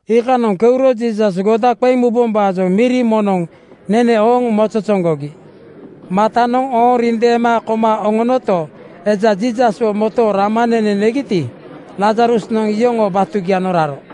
Iikanoŋ keuro Jiisas goda qeŋ mubombaajoŋ miri moŋnoŋ nene ooŋ mozozoŋgogi. Martanoŋ ooŋ rindeema koma oŋonoto, eja Jiisaswo motooŋ rama nene negiti, Lazarusnoŋ iyoŋoo batugianoŋ raro.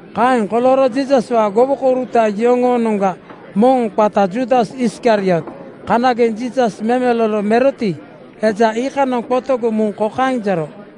Kaeŋ kolooro Jiisaswaa gowokouruta yoŋoonoŋga moŋ qata Juudas Iskariot, kanageŋ Jiisas memelolo meroti, eja iikanoŋ qotogoŋ muŋ kokaeŋ jero,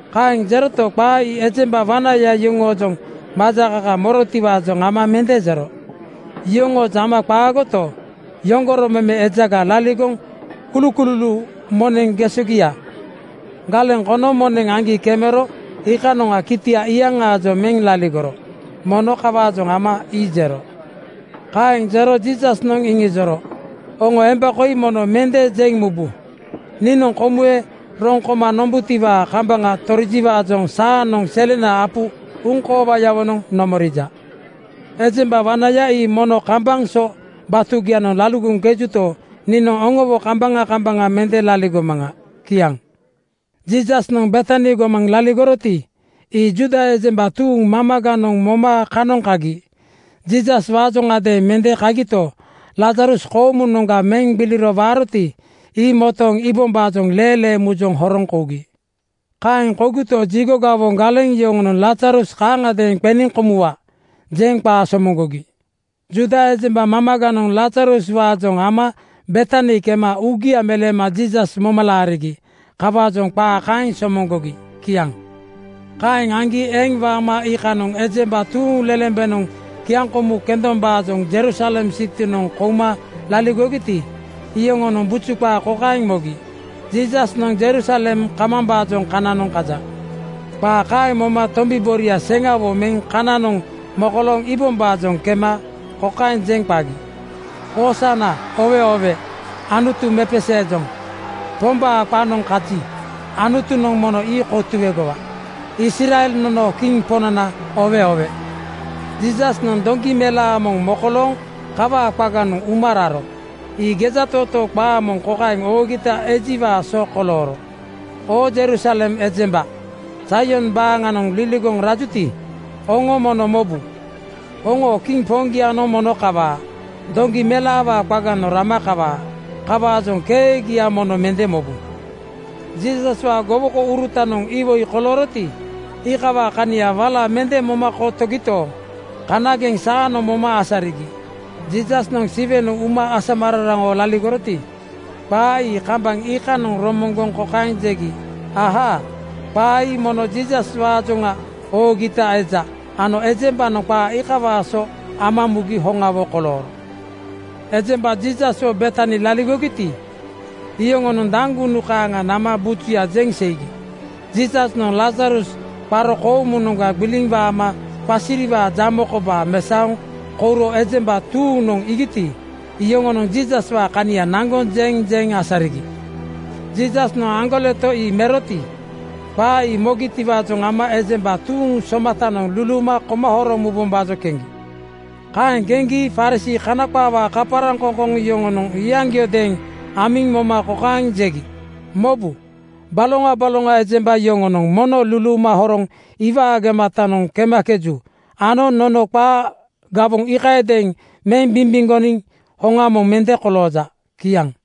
Kaeŋ jeroto, qaa ii ejemba wanaya yoŋoojoŋ majakaka morotiwaajoŋ ama mende jero. Yoŋoojoŋ ama qaagoto, yoŋgoro meme ejaga laligoŋ kulukululuu moneŋ gesogia galeŋ kono moneŋ aŋgi kemero iikanoŋa kitia iyaŋaajoŋ meŋ laligoro. Mono kawaajoŋ ama ii jero. Kaeŋ jero Jiisasnoŋ iŋijoro, “Oŋo emba koi mono mende jeŋ mubu. Niinoŋ komuwe roŋ koma nombutiwaa kambaŋa torijiwaajoŋ saanoŋ selena apu uŋkoowayawonoŋ nomorija. Ejemba wanaya ii mono kambaŋ so batugianoŋ laligoŋkejuto, niinoŋ oŋowo kambaŋa kambaŋa mende laligomaŋa.” Kiaŋ. Jiisasnoŋ Betani gomanoŋ laligoroti, ii Juuda ejemba tuuŋ mamaganoŋ moma kanoŋ kagi. Jiisaswaajoŋgadeeŋ mende kagito, Lazarus koomunoŋga meŋ gbiliro waaroti, ii motooŋ iibombaajoŋ leelee mujoŋ horoŋ kougi. Kaeŋ kougito, jigo gawoŋ galeŋ yoŋonoŋ “Lazarus kaaŋagadeeŋ qeniŋ komuwa,” jeŋ qaa somoŋgogi. Juuda ejemba mamaganoŋ Lazaruswaajoŋ ama Betani kema uugia meleema Jiisas moma laarigi. Kawaajoŋ qaa kaeŋ somoŋgogi. Kiaŋ. Kaeŋ aŋgi eŋ waama iikanoŋ ejemba tuuŋlelembenoŋ kiaŋkomu kendombaajoŋ Jerusalem sitinoŋ kouma laligogiti, iyoŋonoŋ buju qaa kokaeŋ mogi, “Jiisasnoŋ Jerusalem kamambaajoŋ kananoŋ kaja.” Qaa kaeŋ moma tombi boria seŋawo meŋ kananoŋ mokolooŋ iibombaajoŋ kema kokaeŋ jeŋ qagi, “Hoosana! Oowe oowe! Anutu mepeseejoŋ. Pombaa qanoŋ kaji, Anutunoŋ mono ii kotuegowa! Israel nonoo Kiŋ Poŋnana oowe oowe!” Jiisasnoŋ doŋgi melaa moŋ mokolooŋ kawaa qaganoŋ uma raro. Ii gejatootoo qaa moŋ kokaeŋ oogita ejiwaa so kolooro, “Oo Jerusalem ejemba Zaion baaŋa liligoŋ rajuti, oŋo mono mobu, oŋoo Kiŋ Poŋgianoŋ mono kawaa. Doŋgi melaawaa qaganoŋ rama kawaa. Kawaajoŋ keegia mono mende mobu.” Jiisaswaa gowokourutanoŋ iwoi kolooroti, iikawaa kania wala mende moma kotogito, kanageŋ saanoŋ moma asarigi. Jiisasnoŋ Siwenoŋ uma asamararaŋawo laligoroti, qaa ii kambaŋ iikanoŋ romoŋgoŋ kokaeŋ jegi, “Ahaa! Qaa ii mono Jiisaswaajoŋa oogita eja ano ejembanoŋ qaa iikawaa so ama mugi hoŋawo kolooro.” Ejemba Jiisaswo Betani laligogiti, iyoŋonoŋ daŋgunu kaaŋa nama bujuya jeŋ seigi. Jiisasnoŋ Lazarus qaro koomunoŋga gbiliŋ waama qasiriwaa jamo kobaa mesaoŋ kouro ejemba tuuŋnoŋ iigiti, iyoŋonoŋ Jiisaswaa kania naŋgoŋ jeŋ jeŋ asarigi. Jiisasnoŋ aŋgoleto ii meroti, qaa ii mogitiwaajoŋ ama ejemba tuuŋ somatanoŋ luluuma koma horoŋ mubombaajoŋ keŋgi. Kaeŋ keŋgi Farisii (Kana qaawaa kaparaŋkoŋkoŋ) yoŋonoŋ iyaŋgiodeeŋ amiŋ moma kokaeŋ jegi, “Mobu. Baloŋa baloŋa ejemba yoŋonoŋ mono luluuma horoŋ iwaa gematanoŋ kemakeju ano nono qaa gawoŋ iikayadeeŋ meŋ bimbimgoniŋ hoŋa moŋ mende kolooja.” Kiaŋ.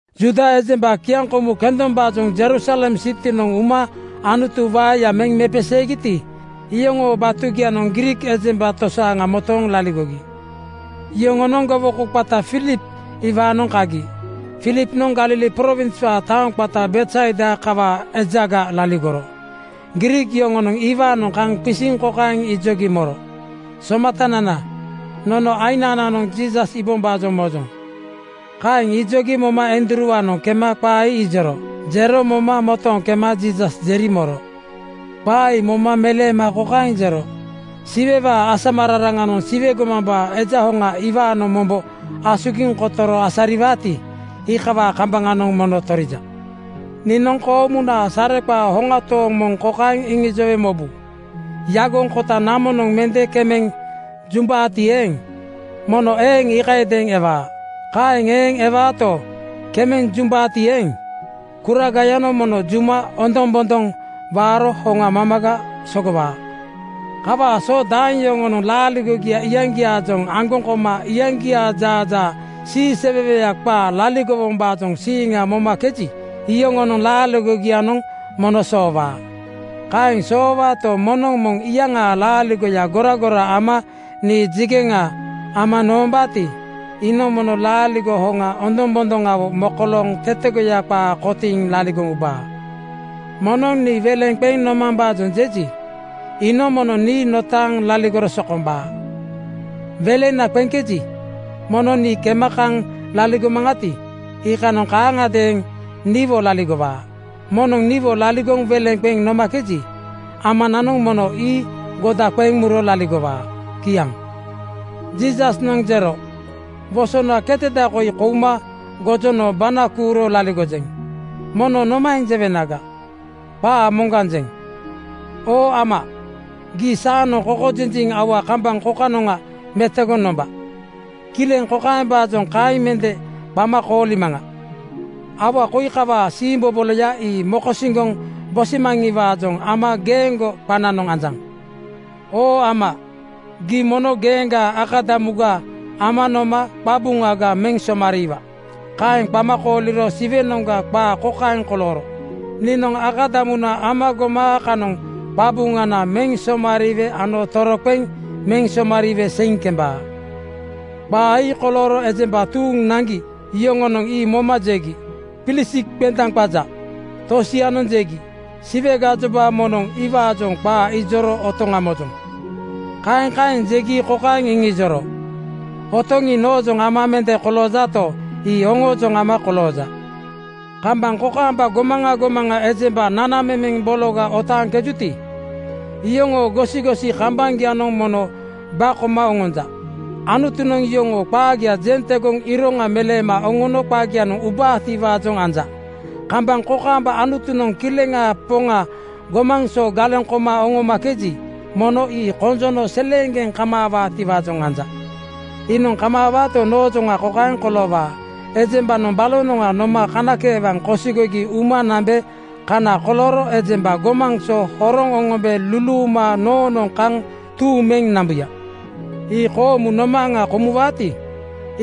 Juuda ejemba kiaŋkomu kendombaajoŋ Jerusalem sitinoŋ uma Anutu waeya meŋ mepeseegiti, iyoŋoo batugianoŋ Griik ejemba tosaaŋa motooŋ laligogi. Yoŋonoŋ gowoko qata Filip iwaanoŋ kagi. Filipnoŋ Galili prowinswaa taoŋ qata Betsaida kawaa ejaga laligoro. Griik yoŋonoŋ iwaanoŋ kaŋ qisiŋ kokaeŋ ijogi moro, “Somatanana, nono aiŋnananoŋ Jiisas iibombaajoŋ mojoŋ.” Kaeŋ ijogi moma Andruuwaanoŋ kema qaa ii ijoro. Jero moma motooŋ kema Jiisas jeri moro. Qaa ii moma meleema kokaeŋ jero, “Siwewaa asamararaŋanoŋ Siwe gomambaa Eja Hoŋa iwaanoŋ mombo asugiŋ kotoro asariwaati, iikawaa kambaŋanoŋ mono torija. Niinoŋ koomunaa sare qaa hoŋa tooŋ moŋ kokaeŋ iŋijowe mobu: Yagoŋ kota namonoŋ mende kemeŋ jumbaati eeŋ, mono eeŋ iikayadeeŋ ewaa. Kaeŋ eeŋ ewaato, kemeŋ jumbaati eeŋ, kuragayanoŋ mono juma ondoŋbondoŋ waaro hoŋa mamaga sogowaa. “Kawaa so daeŋ yoŋonoŋ laaligogia iyaŋgiaajoŋ aŋgoŋ koma iyaŋgiaa jaajaa siiseweweya qaa laligowombaajoŋ siiŋa momakeji, iyoŋoo laaligogianoŋ mono soowaa. Kaeŋ soowaato, moŋnoŋ moŋ iyaŋaa laaligoya goragora ama niijegeŋa ama nombaati, iinoŋ mono laaligo hoŋa ondoŋbondoŋawo mokolooŋ tetegoya qaa kotiiŋ laligoŋ ubaa. Moŋnoŋ nii weleŋ qeŋ nomambaajoŋ jeji, iinoŋ mono nii notaaŋ laligoro sokombaa. Welena qeŋkeji, mono nii kema kaŋ laligomaŋati, iikanoŋ kaaŋagadeeŋ niwo laligowaa. Moŋnoŋ niwo laligoŋ welena qeŋ nomakeji, Amanoŋ mono ii goda qeŋ muro laligowaa.” Kiaŋ. Jiisasnoŋ jero, “Wosona keteda koi kouma gojono bana kuuro laligojeŋ. Mono nomaeŋ jewenaga? Qaa moŋganjeŋ. Oo Ama, gii saanoŋ konjiliŋ aua kambaŋ kokanoŋa metogoŋ nomba. Kileŋ kokaembaajoŋ kaeŋ mende qama koolimaŋa: Aua koi kawaa siimboboloya ii mokosiŋgoŋ bosimaŋiwaajoŋ ama geeŋgo qananoŋ anjaŋ. Oo Ama, gii mono geeŋgaa akadamuga ama noma qabuŋaga meŋ somariiwa.” Kaeŋ qama kooliro Siwenoŋga qaa kokaeŋ kolooro, “Niinoŋ akadamuna ama goma kanoŋ qabuŋana meŋ somariiwe ano toroqeŋ meŋ somariiwe seiŋ kembaa.” Qaa ii kolooro ejemba tuuŋ naŋgi yoŋonoŋ ii moma jegi, “Pilisik qendaŋ qaja.” Tosianoŋ jegi, “Siwe gajoba moŋnoŋ iwaajoŋ qaa ijoro otoŋa mojoŋ.” Kaeŋ kaeŋ jegi kokaeŋ iŋijoro, “Otoŋ ii noojoŋ ama mende koloojato, ii oŋoojoŋ ama kolooja. Kambaŋ kokaamba gomaŋa gomaŋa ejemba nanamemeŋ bologa otaaŋkejuti, iyoŋoo gosigosi kambaŋgianoŋ mono ba koma oŋonja. Anutunoŋ yoŋoo qaagia jeŋ tegoŋ iroŋa meleema oŋono qagianoŋ ubaatiwaajoŋ anja. Kambaŋ kokaamba Anutunoŋ Kileŋaa Poŋa gomaŋ so galeŋ koma oŋomakeji, mono ii konjono seleeŋgeŋ kamaawaatiwaajoŋ anja. Iinoŋ kamaawaato, noojoŋa kokaeŋ koloowaa: Ejembanoŋ balonoŋga noma kanakeewaŋ kosigogi uma nambe kana kolooro ejemba gomaŋ so horoŋ oŋombe luluuma noonoŋ kaŋ tuuŋ meŋ nambuya.” Ii koomu nomaaŋa komuwaati,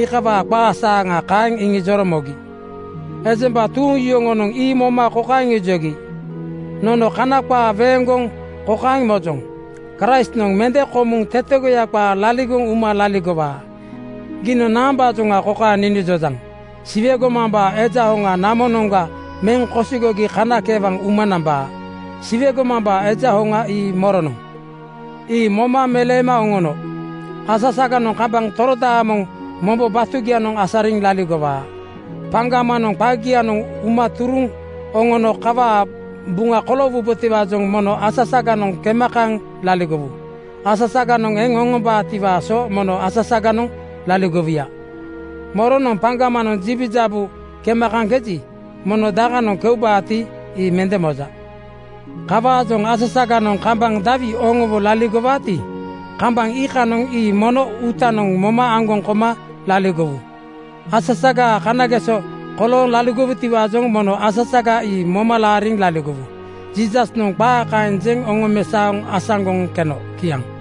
iikawaa qaa saaŋa kaeŋ iŋijoro mogi. Ejemba tuuŋ yoŋonoŋ ii moma kokaeŋ ijogi, “Nono Kana qaa weeŋgoŋ kokaeŋ mojoŋ, ‘Kraistnoŋ mende komuŋ tetegoya qaa laligoŋ uma laligowaa.’ Giinoŋ naambaajoŋa kokaeŋ ninijojaŋ, ‘Siwe gomambaa Eja Hoŋa namonoŋga meŋ kosigogi kanakeewaŋ uma nambaa.’ Siwe gomambaa Eja Hoŋa ii moronoŋ?” Ii moma meleema oŋono, “Asasaganoŋ kambaŋ torodaamoŋ mombo batugianoŋ asariŋ laligowaa. Paŋgamanoŋ qagianoŋ uma turuŋ oŋono kawaa buŋa koloowubotiwaajoŋ mono asasaganoŋ kema kaŋ laligowu. Asasaganoŋ eŋ oŋombaatiwaa so mono asasaganoŋ laligowuya. Moronoŋ paŋgamanoŋ jibujabu kema kaŋkeji, mono dakanoŋ keubaati, ii mende moja. Kawaajoŋ asasaganoŋ kambaŋ dawi oŋowo laligowaati, kambaŋ iikanoŋ ii mono uutanoŋ moma aŋgoŋ koma laligowu. Asasagaa kanageso kolooŋ laligowutiwaajoŋ mono asasaga ii moma laariŋ laligowu.” Jiisasnoŋ qaa kaeŋ jeŋ oŋomesaoŋ asaŋgoŋ keno. Kiaŋ.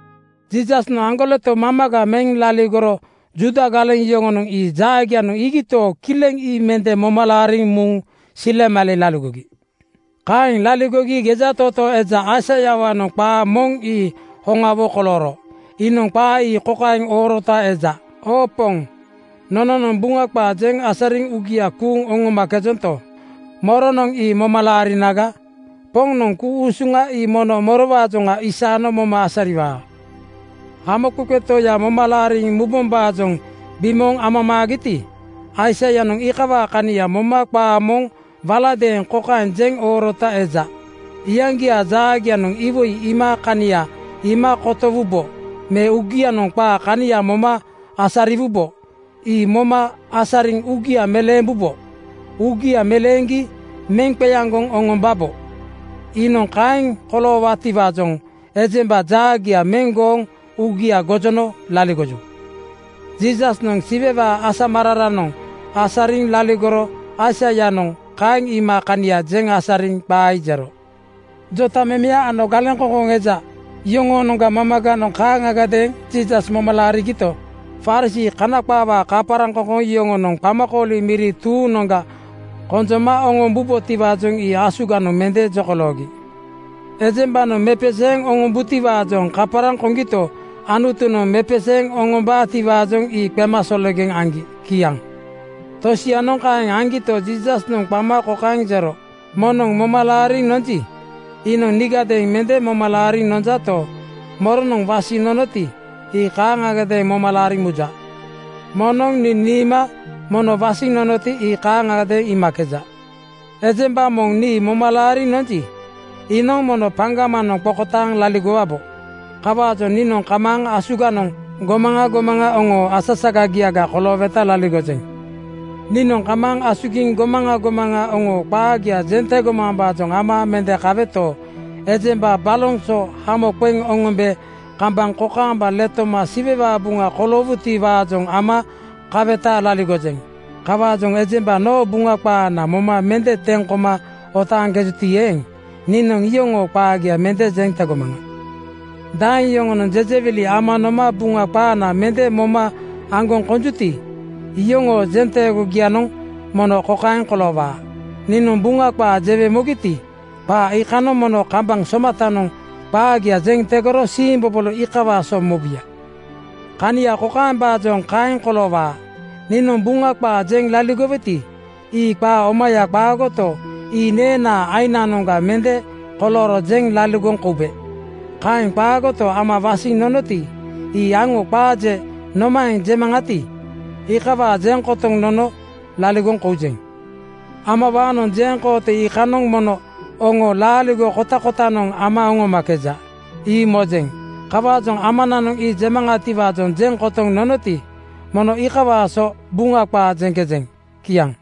Jiisasnoŋ aŋgoleto mamaga meŋ laligoro Juuda galeŋ yoŋonoŋ ii jaagianoŋ iigito, kileŋ ii mende moma laariŋ muŋ silemale laligogi. Kaeŋ laligogi gejatootoo eja Aisaiawaanoŋ qaa moŋ ii hoŋawo kolooro. Iinoŋ qaa ii kokaeŋ oorota eja, “Oo Poŋ, nononoŋ Buŋa qaa jeŋ asariŋ uugia kuuŋ oŋomakejonto, moronoŋ ii moma laarinaga? Poŋnoŋ ku-usuŋa ii mono morowaajoŋa isaano moma asariwaa?” Hamoqeqe Toya moma laariŋ mubombaajoŋ bimooŋ amamaagiti, Aisaianoŋ iikawaa kania moma qaa moŋ waladeeŋ kokaeŋ jeŋ oorota eja, “Iyaŋgiaa jaagianoŋ iwoi iima kania iima kotowubo me uugianoŋ qaa kania moma asariwubo. Ii moma asariŋ uugia meleembubo. Uugia meleeŋgi meŋ qeaŋgoŋ oŋomambo. Iinoŋ kaeŋ koloowabotiwaajoŋ ejemba jaagia meŋ gooŋ uugia gojono laligoju.” Jiisasnoŋ Siwewaa asamararanoŋ asariŋ laligoro Aisaianoŋ kaeŋ iima kania jeŋ asariŋ qaa ii jero. Jotamemeya ano galeŋkoŋkoŋ eja yoŋoonoŋga mamaganoŋ kaaŋagadeeŋ Jiisas moma laarigito, Farisii (Kana qaawaa kaparaŋkoŋkoŋ) yoŋonoŋ qamakooli miri tuuŋnoŋga konjoma oŋombubotiwaajoŋ ii asuganoŋ mende jokoloogi. Ejembanoŋ mepeseeŋ oŋombutiwaajoŋ kaparaŋ koŋgito, Anutunoŋ mepeseeŋ oŋombaatiwaajoŋ ii qemasologeŋ aŋgi. Kiaŋ. Tosianoŋ kaeŋ aŋgito, Jiisasnoŋ qama kokaeŋ jero, “Moŋnoŋ moma laariŋ nonji, iinoŋ niigadeeŋ mende moma laariŋ nonjato, moronoŋ wasiŋ nonoti, ii kaaŋagadeeŋ moma laariŋ muja. Moŋnoŋ nii niima mono wasiŋ nonoti, ii kaaŋagadeeŋ iimakeja. Ejemba moŋ nii moma laariŋ nonji, iinoŋ mono paŋgamanoŋ qokotaaŋ laligowabo. Kawaajoŋ niinoŋ kamaaŋ asugiŋ gomaŋa gomaŋa oŋoo asasagagiaga kolooweta laligojeŋ. “Niinoŋ kamaaŋ asugiŋ gomaŋa gomaŋa oŋoo qaagia jeŋ tegomambaajoŋ ama mende kaweto, ejemba baloŋ so hamo qeŋ oŋombe kambaŋ kokaamba letoma Siwewaa buŋa koloowuti-waajoŋ ama kaweta laligojeŋ. Kawaajoŋ ejemba noo Buŋa qaana moma mende teŋ koma otaaŋkejuti eeŋ, niinoŋ iyoŋoo qaagia mende jeŋ tegomaŋa. Daeŋ yoŋonoŋ jejewili ama noma Buŋa qaana mende moma aŋgoŋ konjuti, iyoŋoo jeŋ teegogianoŋ mono kokaeŋ koloowaa: Niinoŋ Buŋa qaa jewe mogiti, qaa iikanoŋ mono kambaŋ somatanoŋ qaagia jeŋ tegoro siimbobolo iikawaa so mobuya. “Kania kokaembaajoŋ kaeŋ koloowaa: Niinoŋ Buŋa qaa jeŋ laligoweti, ii qaa omaya qaagoto, ii neenaa ainanoŋga mende kolooro jeŋ laligoŋ koube. Kaeŋ qaagoto, Ama wasiŋ nonoti, ii aŋo qaa je nomaeŋ jemaŋati, iikawaa jeŋ kotoŋ nono jeŋ laligoŋ koujeŋ. Amawaanoŋ jeŋkooto iikanoŋ mono oŋo laaligo kotakotanoŋ ama oŋomakeja, ii mojeŋ. Kawaajoŋ Amananoŋ ii jemaŋatiwaajoŋ jeŋ kotoŋ nonoti, mono iikawaa so Buŋa qaa jeŋkejeŋ.” Kiaŋ.